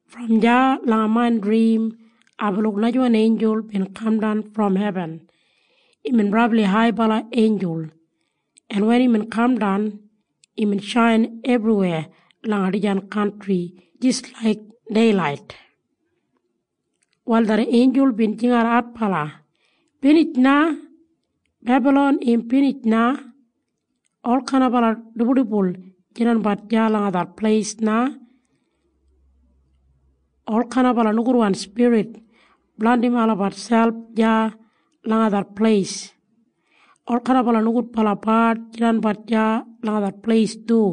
Brom deya langa main drim aibin luk najawan einjul bin kamdan brom hebin. Imbin brabli haibala einjul, en wen imbin kamdan, imbin shain ebriweya langa dijan kantri jis laik deilait. Wal det einjul bin jingat adbala, “Binij na! Bebalon im binij na! Olkain dibuldibul jidanbat deya langa det pleis na. Olkain nogudwan spirit blandim olabat selp deya langa det pleis. Olkain nogudbala bard jidanbat deya langa det pleis du.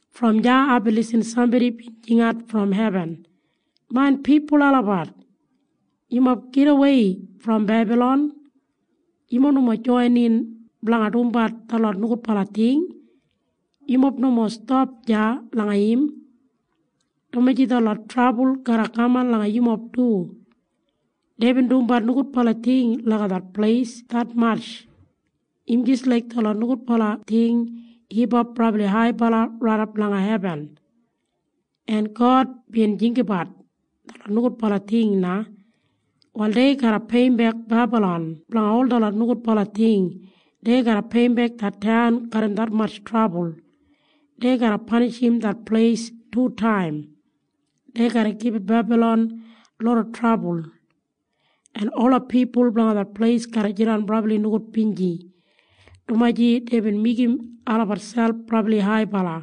Brom deya aibin lisin sambodi bin jingat brom hebin, “Main pipul olabat! Yumob gidawei brom Bebalon! Yumob nomo joinin blanga dumbat detlot nogudbala ting. Yumob nomo stap deya langa im, dumaji detlot trabul garra kaman langa yumob du. Deibin dumbat nogudbala ting langa det pleis detmatj. Im jis laik detlot nogudbala ting hipap brabli haibala raidap langa hebin, en God bin jinggabat detlot nogudbala ting na. “Wal dei garra peiyimbek Bebalon blanga ol detlot nogudbala ting. Dei garra peiyimbek det taun garram detmatj trabul. Dei garra panishim det pleis tutaim. Dei garra gibit Bebalon loda trabul, en ola pipul blanga det pleis garra jidan brabli nogudbinji, dumaji deibin meigim olabat selp brabli haibala,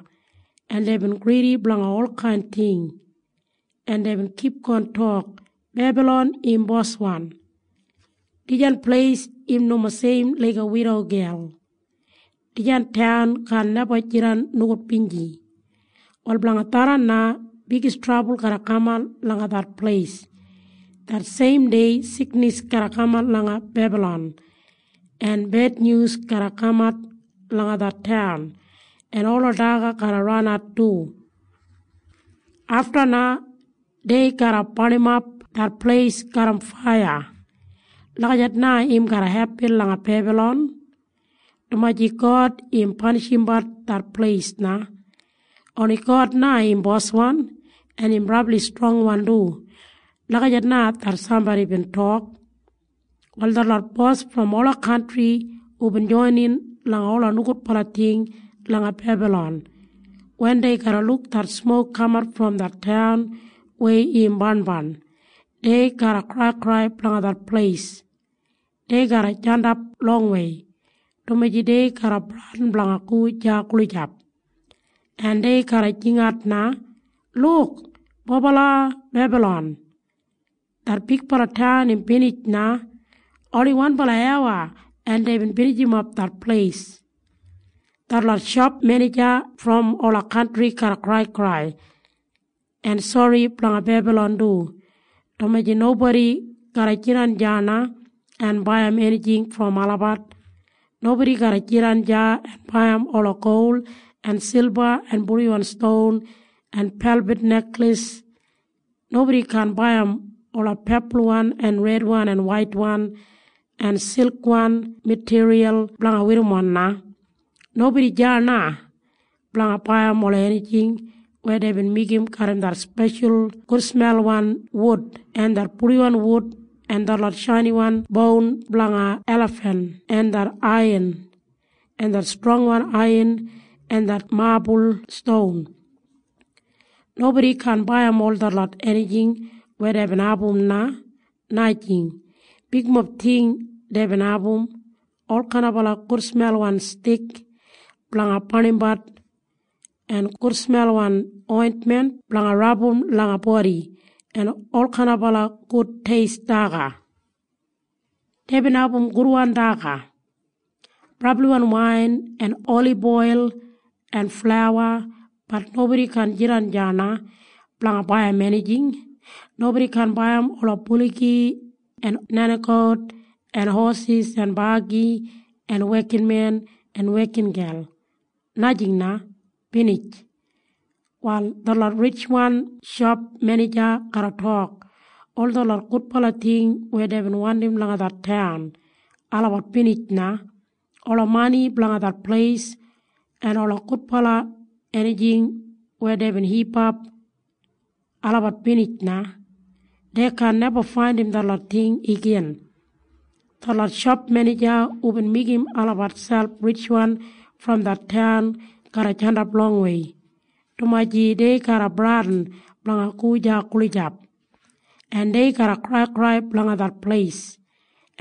en deibin gridi blanga olkain ting, en deibin kipgon tok, ‘Bebalon im boswan. Dijan pleis im nomo seim laiga widogel. Dijan taun kaan neba jidan nogudbinji.’ Wal blanga tharran na bigis trabul garra kaman langa det pleis. Det seim dei siknis garra kaman langa Bebalon, en bednyus garra kamat langa det taun, en ola daga garra ranat du. Afta na dei garra barnimap det pleis garram faiya. Lagijat na im garra hepin langa Bebalon, dumaji God im panishimbat det pleis na. Oni God na im Boswan, en im brabli strongwan du.” Lagijat na det sambodi bin tok. Wal detlot bos brom ola kantri hubin joinin langa ola nogudbala ting langa Bebalon, wen dei garra luk det smok kamat brom det taun weya im barnbarn, dei garra kraikrai blanga det pleis. Dei garra jandap longwei, dumaji dei garra bradin blanga go deya gulijap, en dei garra jingat na, “Luk! Bobala Bebalon! Det bigbala taun im binij na! Oni wanbala awa en deibin binijimap det pleis!” Detlot shop menija brom ola kantri garra kraikrai en sori blanga Bebalon du, dumaji nobodi garra jidan deya na en baiyim enijing brom olabat. Nobodi garra jidan deya en baiyim ola gol en silba en purdiwan ston en pelbid nekleis. Nobodi kaan baiyim ola pepulwan en redwan en waitwan en silkwan matiriyal blanga werrimon na. Nobodi deya na blanga baiyim ola enijing weya deibin meigim garram det speshal gudsmelwan wud en det purdiwan wud en detlot shainiwan boun blanga elafen en det aiyan en det strongwan aiyan en det mabul ston. Nobodi kaan baiyim ol detlot enijing weya deibin abum na, najing. Bigmob ting deibin abum. Olkain gudsmelwan stik blanga barnimbat, en gudsmelwan ointmen blanga rabum langa bodi, en olkain gud teist daga. Deibin abum gudwan daga, brabliwan wain en oliboil en flauwa. Bat nobodi kaan jidan deya na blanga baiyim enijing. Nobodi kaan baiyim ola buligi en nenigout en hosis en bagi en wekinmen en wekingel. Najing na, binij. Wal detlot ritjwan shop menija garra tok, “Ol detlot gudbala ting weya deibin wandim langa det taun, olabat binij na. Ola mani blanga det pleis en ola gudbala enijing weya deibin hipap, olabat binij na. Dei kaan neba faindim detlot ting igin.” Detlot shop menija hubin meigim olabat selp ritjwan brom det taun garra jandap longwei, dumaji dei garra bradin blanga go deya gulijap, en dei garra kraikrai blanga det pleis,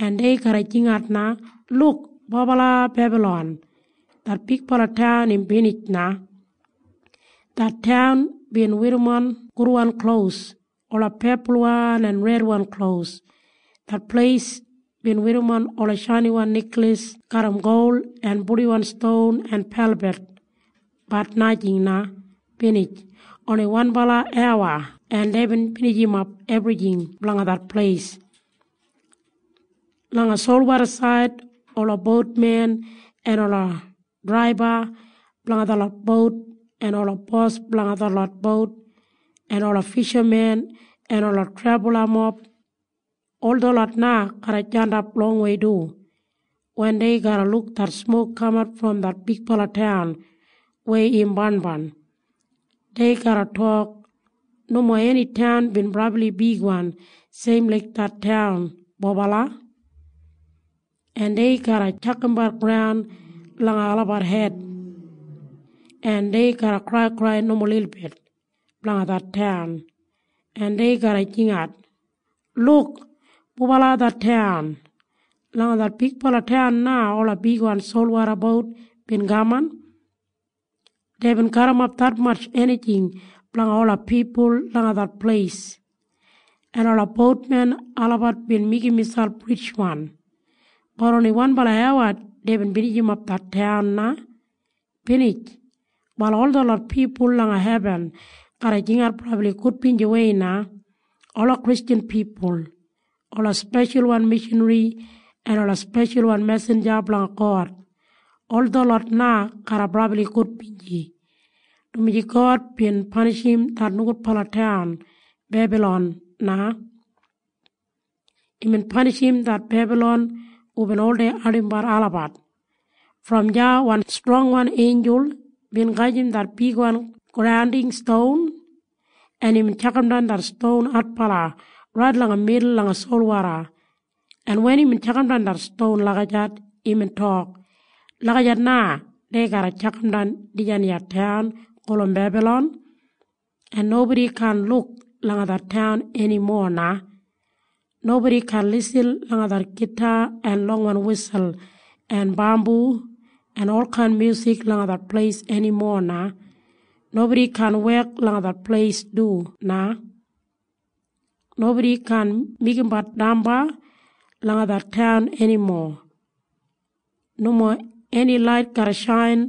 en dei garra jingat na, “Luk! Bobala Bebalon! Det bigbala taun im binij na! Det taun bin werrimon gudwan klos, ola pepulwan en redwan klos. Det pleis bin werrimon ola shainiwan nekleis garram gol en purdiwan ston en pelbid. Bat najing na, binij! Oni wanbala awa en deibin binijimap ebrijing blanga det pleis!” Langa solwodasaid ola boutmen en ola draiba blanga detlot bout en ola bos blanga detlot bout en ola fishamen en ola trebalamob, ol detlot na garra jandap longwei du. Wen dei garra luk det smok kamat brom det bigbala taun weya im barnbarn, dei garra tok, “Nomo eni taun bin brabli bigwan seim laik det taun, bobala!” En dei garra tjakambat graun langa olabat hed, en dei garra kraikrai nomo lilbit blanga det taun, en dei garra jingat, “Luk! Bobala det taun! Langa det bigbala taun na ola bigwan solwoda bout bin kaman. Deibin garrimap detmatj enijing blanga ola pipul langa det pleis, en ola boutmen olabat bin meigim miselp ritjwan. Bat oni wanbala awa en deibin binijimap det taun na, binij!” Wal ol detlot pipul langa hebin garra jingat brabli gudbinjiwei na. Ola Kristjan pipul, ola speshalwan mishanri en ola speshalwan mesinja blanga God, ol detlot na garra brabli gudbinji, dumaji God bin panishim det nogudbala taun Bebalon na. Imbin panishim det Bebalon hubin oldei ardimbat olabat. Brom deya wan strongwan einjul bin gajim det bigwan granding ston, en imbin tjakamdan det ston adbala rait langa midul langa solwoda, en wen imbin tjakamdan det ston lagijat, imbin tok, “Lagijat na dei garra tjakamdan dijan iya taun gulum Bebalon, en nobodi kaan luk langa det taun enimo na. Nobodi kaan lisin langa det gita en longwan wisul en bambu en olkain myusik langa det pleis enimo na. Nobodi kaan wek langa det pleis du na. Nobodi kaan meigimbat damba langa det taun enimo. Nomo eni lait garra shain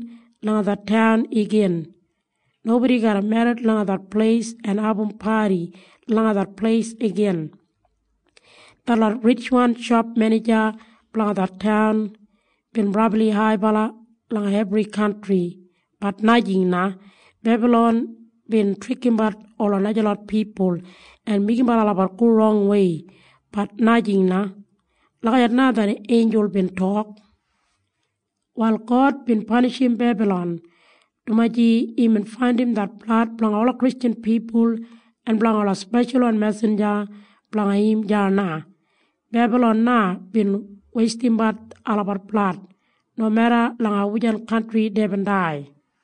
langa det taun igin. Nobodi garra merrit langa det pleis en abum padi langa det pleis igin. Detlot ritjwan shop menija blanga det taun bin brabli haibala langa ebri kantri. Bat najing na. Bebalon bin trikimbat ola najalot pipul en meigimbat olabat go rongwei. Bat najing na.” Lagijat na det einjul bin tok. Wal God bin panishim Bebalon, dumaji imbin faindim det blad blanga ola Kristjan pipul en blanga ola speshalwan mesinja blanga im deya na. Bebalon na bin weistimbat olabat blad, nomeda langa wujan kantri deibin dai.